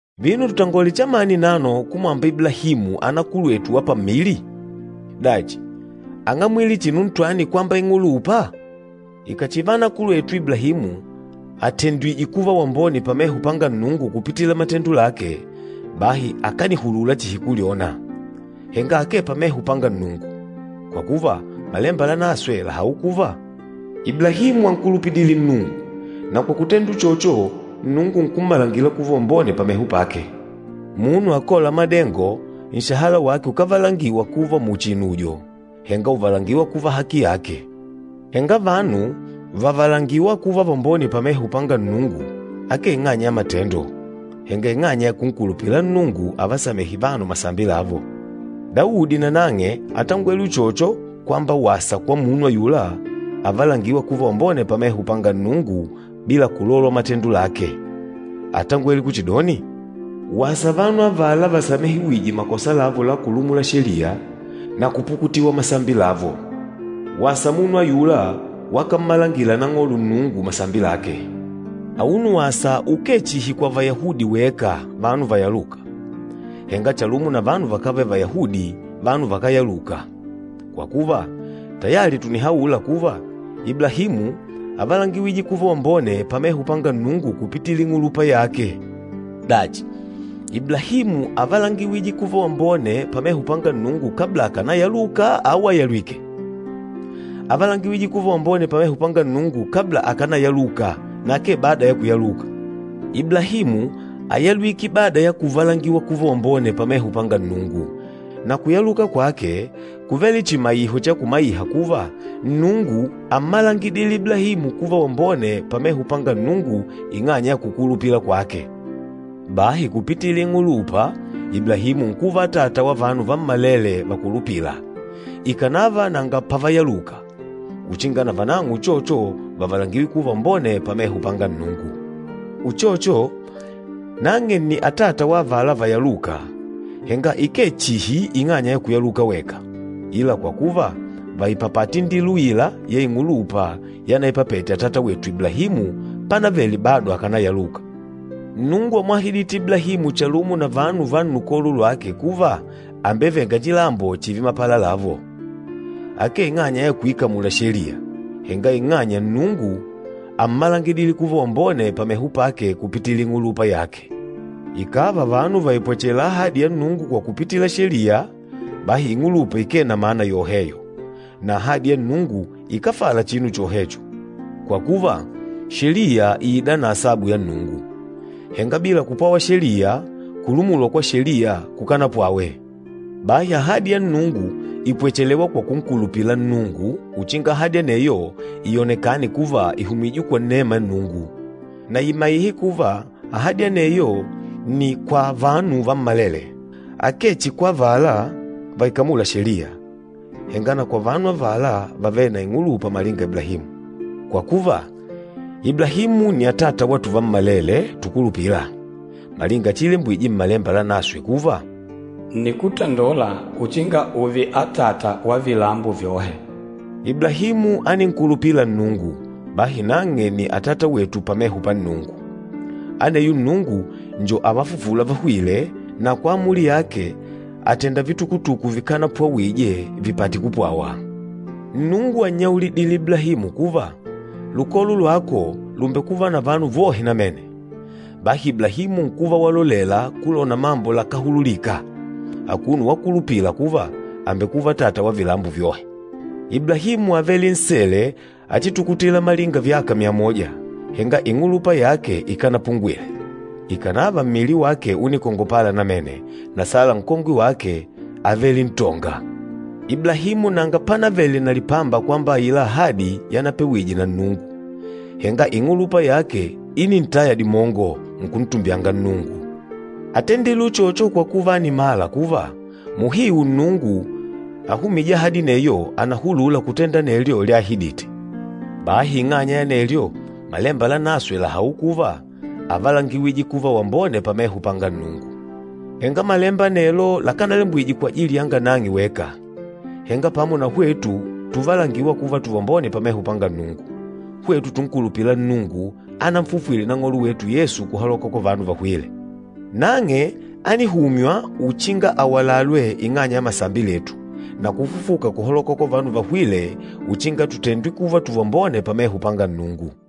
Vino, tutangole chamani nano kumwamba Iblahimu, anakulwetu wa pammili? Dachi, áng'amwile chinu ntwani kwamba ing'ulupa? Ikàchiva anakulwetu Iblahimu atendwìjè kuva wambone pameho panga Nnungu kupitila matendo lake, bahi akànihulula chihi kulyona, henga akee pameho panga Nnungu. Kwa kuva, Malemba Lanaswe làhaula kuva, “Iblahimu ánkulupidile Nnungu, na kwa kutenda uchocho Nnungu nkummalangila kuva wambone pameho pake.” Munu akôla madengo, nshahala wake ukávalangiwa kuva muchi inujo, henga ùvalangiwa kuva haki yake. Henga vanu vàvalangiwa kuva vambone pameho panga Nnungu akee ing'anya ya matendo, henga ing'anya ya kunkulupila Nnungu avasamêhe vanu masambi lavo. Daudi nanang'e átangwele uchocho kwamba wasa kwa munu ayula avalangîwa kuva wambone pameho panga Nnungu bila kulolwa matendo lake. Átangwele kuchidoni, “Wasa vanu avala vasamehewîje makosa lavo la kulumula Sheliya, na kupukutiwa masambi lavo. Wasa munu ayula, wakammalangila Nang'olo Nnungu masambi lake.” Auno wasa ukee chihi kwa Vayahudi weka, vanu vayalûka, henga chalumo na vanu vakávele Vayahudi, vanu vakáyaluka. Kwa kuva, tayali tùnihaula kuva, Iblahimu ávalangiwije kuva wambone pameho panga Nnungu kupitila ing'ulupa yake. Dachi, Iblahimu ávalangiwije kuva wambone pameho panga Nnungu kabla akánayaluka au àyalwike? Ávalangiwije kuva wambone pameho panga Nnungu kabla akánayaluka na akee bada ya kuyaluka. Iblahimu áyalwike bada ya kuvalangiwa kuva wambone pameho panga Nnungu, na kuyaluka kwake kúvele chimaiho cha kumaiha kuva, Nnungu ámmalangidile Iblahimu kuva wambone pameho panga Nnungu ing'anya ya kukulupila kwake. Bahi kupitila ing'ulupa, Iblahimu nkuva atata wa vanu vammalele vakulupîla, ikànava nanga pavayaluka, uchinga na vanang'o uchocho vavalangiwe kuva vambone pameho panga Nnungu. Uchocho, nang'e nni atata wa avala vayalûka, henga ikee chihi ing'anya ya kuyaluka weka, ila kwa kuva vàipapata indila uila ya ing'ulupa yanaipapete atata wetu Iblahimu pánavele bado akánayaluka. Nnungu ámwahidite Iblahimu chalumo na vanu va nnukolo lwake kuva àmbeveng'a chilambo chììve mapala lavo, akee ing'anya ya kuikamula Sheliya, henga ing'anya Nnungu ámmalangidile kuva wambone pameho pake kupitila ing'ulupa yake. Ikàva vanu vàipwachela ahadi ya Nnungu kwa kupitila Sheliya, bahi, ing'ulupa ikee na mana yoheyo, na ahadi ya Nnungu ikáfala chinu chohecho. Kwa kuva, Sheliya ìida na asabu ya Nnungu. Henga bila kupwawa Sheliya, kulumulwa kwa Sheliya kukánapwawe. Bahi ahadi ya Nnungu ìpwechelewa kwa kunkulupila Nnungu uchinga ahadi aneyo ionekane kuva ìhumijwe kwa inema ya Nnungu, na imaihe kuva ahadi aneyo nni kwa vanu vammalele, akee chihi kwa avala vaikamûla Sheliya, henga na kwa vanu avala vavêle na ing'ulupa malinga Iblahimu. Kwa kuva, Iblahimu nni atata wa tuvammalele tukulupîla. Malinga chiilembwije Mmalemba Lanaswe kuva, “Ǹnikuvika ùùve atata wa vilambo vyohe.” Iblahimu áninkulupila Nnungu, bahi nang'e nni atata wetu pameho pa Nnungu. Aneyo Nnungu njo avafufûla vahwîle, na kwa amuli yake àtenda vitukutuku vikanapwawije vipate kupwawa. Nnungu ánnyaulidile Iblahimu kuva, lukolo lwako lùmbekuva na vanu vohe namene. Bahi Iblahimu nkuva walolela kulona mambo lakáhululika, akuno wakulupila kuva àmbekuva atata wa vilambo vyohe. Iblahimu ávele nsele achitukutila malinga vyaka myamoja, henga ing'ulupa yake ikanapungwile, ikànava mmili wake únikongopala namene, na Sala nkongwe wake, ávele ntonga. Iblahimu nanga pánavele na lipamba kwamba aila ahadi yanapewije na Nnungu, henga ing'ulupa yake ínintaya dimongo, nkuntumbyanga Nnungu. Átendile uchocho kwa kuva ánimala kuva, muhiu Nnungu ahumîje ahadi aneyo ànahulula kutenda anelyo lyaahidite. Bahi ing'anya ya anelyo, Malemba Lanaswe làhaula kuva, “Ávalangiwije kuva wambone pameho panga Nnungu.” Henga malemba anelo lakánalembwije kwajili yanga nang'e weka, henga, pamo na hwetu tuvalangîwa kuva tuvambone pameho panga Nnungu, hwetu tunkulupîla Nnungu ánanfufwile Nang'olo wetu Yesu kuhaloka kwa vanu vahwîle. Nang'e ánihumywa uchinga awalalwe ing'anya ya masambi letu, na kufufuka kuhaloka kwa vanu vahwîle uchinga tutendwe kuva tuvambone pameho panga Nnungu.